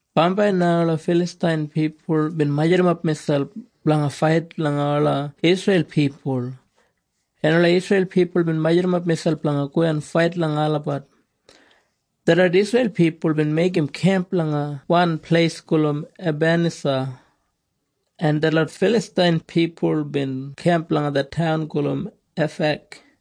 Bambai na ola Filastain pipul bin majurrumap miselp blanga fait langa ola Isreil pipul, en ola Isreil pipul bin majurrumap miselp blanga go en fait langa olabat. Detlot Isreil pipul bin meigim kemp langa wan pleis gulum Ebanisa, en detlot Filastain pipul bin kemp langa det taun gulum Afek.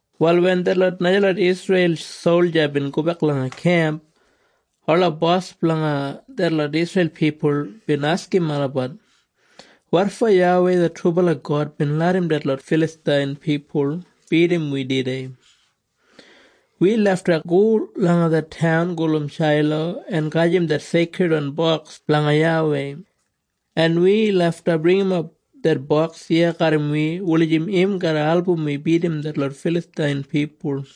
Wal wen detlot najalot Isreil solja bin gobek langa kemp, ola bos blanga detlot Isreil pipul bin askim olabat, “Wotfo YAWEI det trubala God bin larram detlot Filastain pipul bidim wi tudei? Wi lafta go langa det taun gulum Shailo en gajim det Seikridwan Boks blanga YAWEI, en wi lafta bringimap det boks iya garram wi wulijim im garra album wi bidim detlot Filastain pipul.”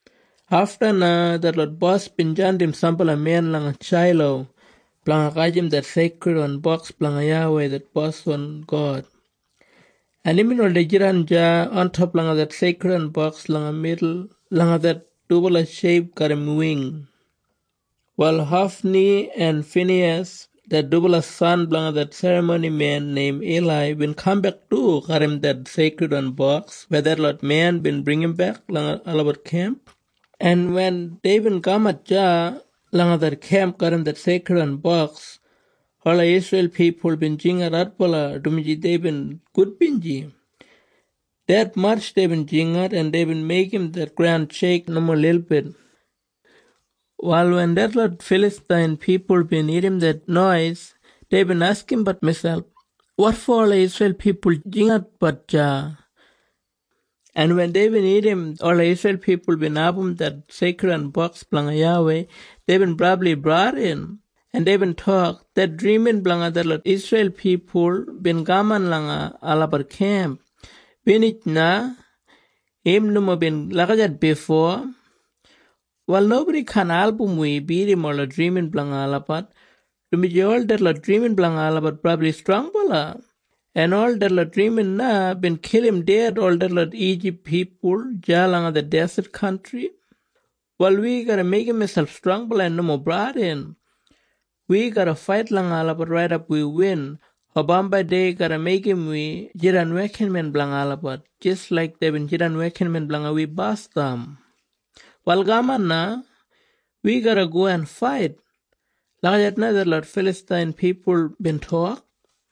Afta na detlot bos bin jandim sambala men langa Shailo blanga gajim det Seikridwan Boks blanga YAWEI det Boswan God, en imbin oldei jidan deya ontop langa det Seikridwan Boks langa midul langa det dubala sheip garram wing. Wal Hofni en Finiyas det dubala san blanga det serramonimen neim Ilai bin kambek du garram det Seikridwan Boks weya detlot men bin bringimbek langa olabat kemp, en wen deibin kamat deya langa det kemp garram det Seikridwan Boks, ola Isreil pipul bin jingat adbala, dumaji deibin gudbinji. Detmatj deibin jingat, en deibin meigim det graun sheik nomo lilbit. Wal wen detlot Filastain pipul bin irrim det nois, deibin askimbat miselp, “Wotfo ola Isreil pipul jingatbat deya?” En wen deibin irrim ola Isreil pipul bin abum det Seikridwan Boks blanga YAWEI, deibin brabli bradin, en deibin tok, “Det drimin blanga detlot Isreil pipul bin kaman langa olabat kemp. Binij na. Im nomo bin lagijat bifo. Wal nobodi kaan album wi bidim ola drimin blanga olabat, dumaji ol detlot drimin blanga olabat brabli strongbala, en ol detlot drimin na bin kilim ded ol detlot Ijip pipul deya langa det deset kantri. Wal wi garra meigim miselp strongbala en nomo bradin. Wi garra fait langa olabat raidap wi win, o bambai dei garra meigim wi jidan wekinmen blanga olabat jis laik deibin jidan wekinmen blanga wi basdam. Wal kaman na. Wi garra go en fait.” Lagijat na detlot Filastain pipul bin tok.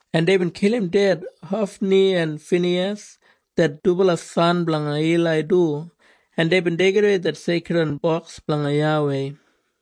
en deibin kilim ded Hofni en Finiyas det dubala san blanga Ilai du, en deibin deigidawei det Seikridwan Boks blanga YAWEI.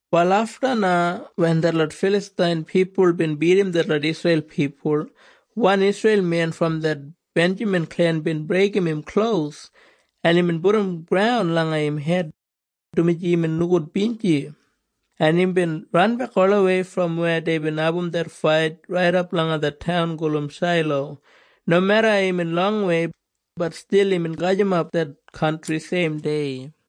Wal afta na wen detlot Filastain pipul bin bidim detlot Isreil pipul, wan Isreil men brom det Benjamin klen bin breigim im klos, en imbin pudum graun langa im hed, dumaji imbin nogudbinji, en imbin ranbek olawei brom weya deibin abum det fait raidap langa det taun gulum Shailo. Nomeda imbin longwei, bat stil imbin gajimap det kantri seimdei.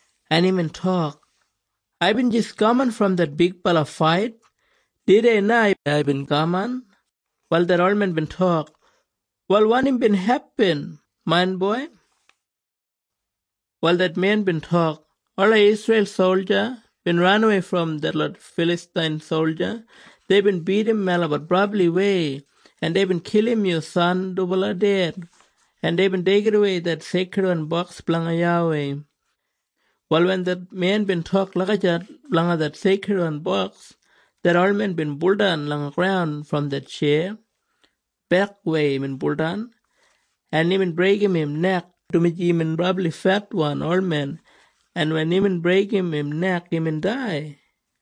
en imbin tok, “Aibin jis kaman brom det bigbala fait. Tudei na aibin kaman.” Wal det olmen bin tok, “Wal wanim bin hepin, main boi?” Wal det men bin tok, “Ola Isreil solja bin ranawei brom detlot Filastain solja. Deibin bidim melabat brabliwei. En deibin kilim yu san dubala ded, en deibin deigidawei det Seikridwan Boks blanga YAWEI.” Wal wen det men bin tok lagijat blanga det Seikridwan Boks, det olmen bin buldan langa graun brom det tjeya. Bekwei imbin buldan, en imbin breigim im nek, dumaji imbin brabli fetwan olmen, en wen imbin breigim im nek, imbin dai.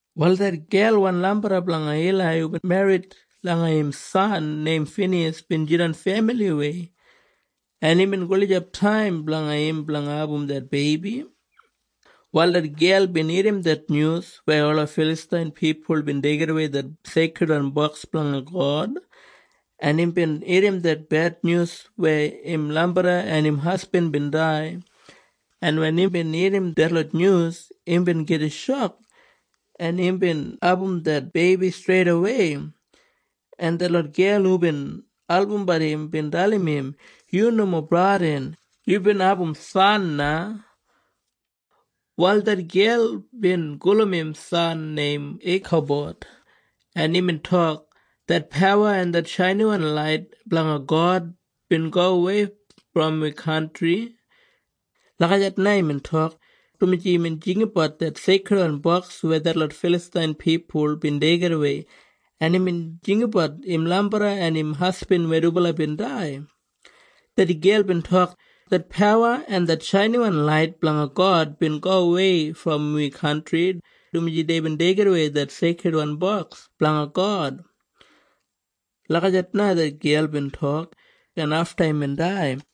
Wal det gelwan lambarra blanga Ilai hubin merrit langa im san neim Finiyas bin jidan femiliwei, en imbin gulijap taim blanga im blanga abum det beibi. Wal det gel bin irrim det nyus weya ola Filastain pipul bin deigidawei det Seikridwan Boks blanga God, en imbin irrim det bednyus weya im lambarra en im hasbin bin dai, en wen imbin irrim detlot nyus, imbin gida shok, en imbin abum det beibi streidawei, en detlot gel hubin albumbat im bin dalim im, “Yu nomo bradin. Yubin abum san na.” Wal det gel bin gulum im san neim Ikabod, en imbin tok, “Det pawa en det shainiwan lait blanga God bin gowei brom wi kantri.” Lagijat na imbin tok, dumaji imbin jinggabat det Seikridwan Boks weya detlot Filastain pipul bin deigidawei, en imbin jinggabat im lambarra en im hasbin weya dubala bin dai. Det gel bin tok, “Det pawa en det shainiwan lait blanga God bin gowei brom wi kantri, dumaji deibin deigidawei det Seikridwan Boks blanga God.” Lagijat na det gel bin tok, en afta imbin dai.